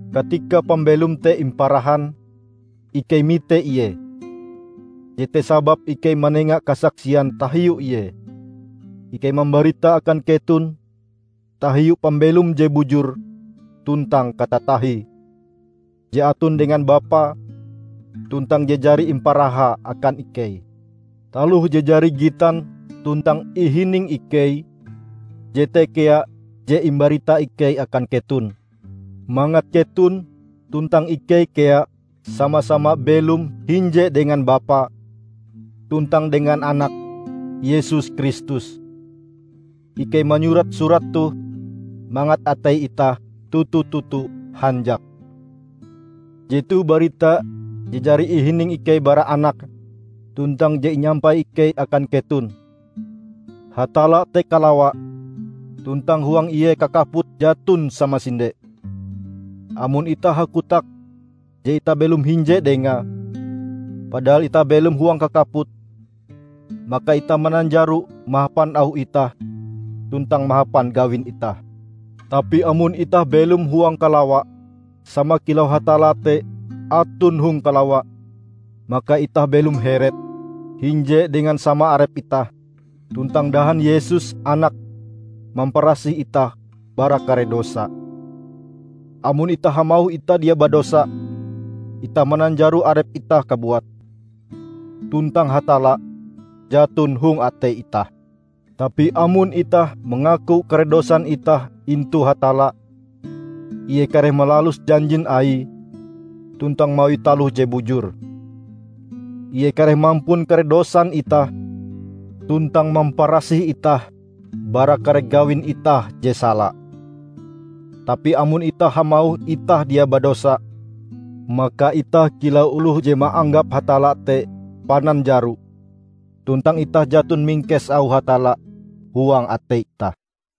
Katika pambelom te imparahan, ikei mite Ie. Jete sababe ikei manenga kasaksian tahiu Ie. Ikei mambarita akan keton tahiu pambelom je bujur tuntang katatahie, je aton dengan Bapa, tuntang je jari imparahae akan ikei. Taloh je jari gitan tuntang ihining ikei, jete kea je imbarita ikei akan keton, mangat keton tuntang ikei kea sama-sama belom hinje dengan Bapa tuntang dengan Anake Yesus Kristus. Ikei manyurat surat toh mangat atei itah toto-toto hanjak. Jetoh barita je jari ihining ikei bara Anake tuntang je inyampai ikei akan keton: Hatalla te kalawa, tuntang huang ie kakaput jaton samasinde. Amon itah hakotak je itah belom hinje Dengae, padahal itah belom huang kakaput, maka itah mananjaro mahapan auh itah tuntang mahapan gawin itah. Tapi amon itah belom huang kalawa sama kilau Hatalla te aton hong kalawa, maka itah belom heret, hinje dengan sama arep itah, tuntang dahan Yesus, Anake, mamparasih itah bara kare dosa. Amon itah hamauh itah dia badosa, itah mananjaro arep itah kabuat; tuntang Hatalla jaton hong atei itah. Tapi amon itah mangaku kare dosan itah intu Hatalla, Ie kareh malalus janjin Aie tuntang mawi taloh je bujur. Ie kareh mampun kare dosan itah tuntang mamparasih itah bara kare gawin itah je sala. Tapi amon itah hamauh itah dia badosa, maka itah kilau oloh je maanggap Hatalla te pananjaro tuntang itah jaton mingkes auh Hatalla huang atei itah.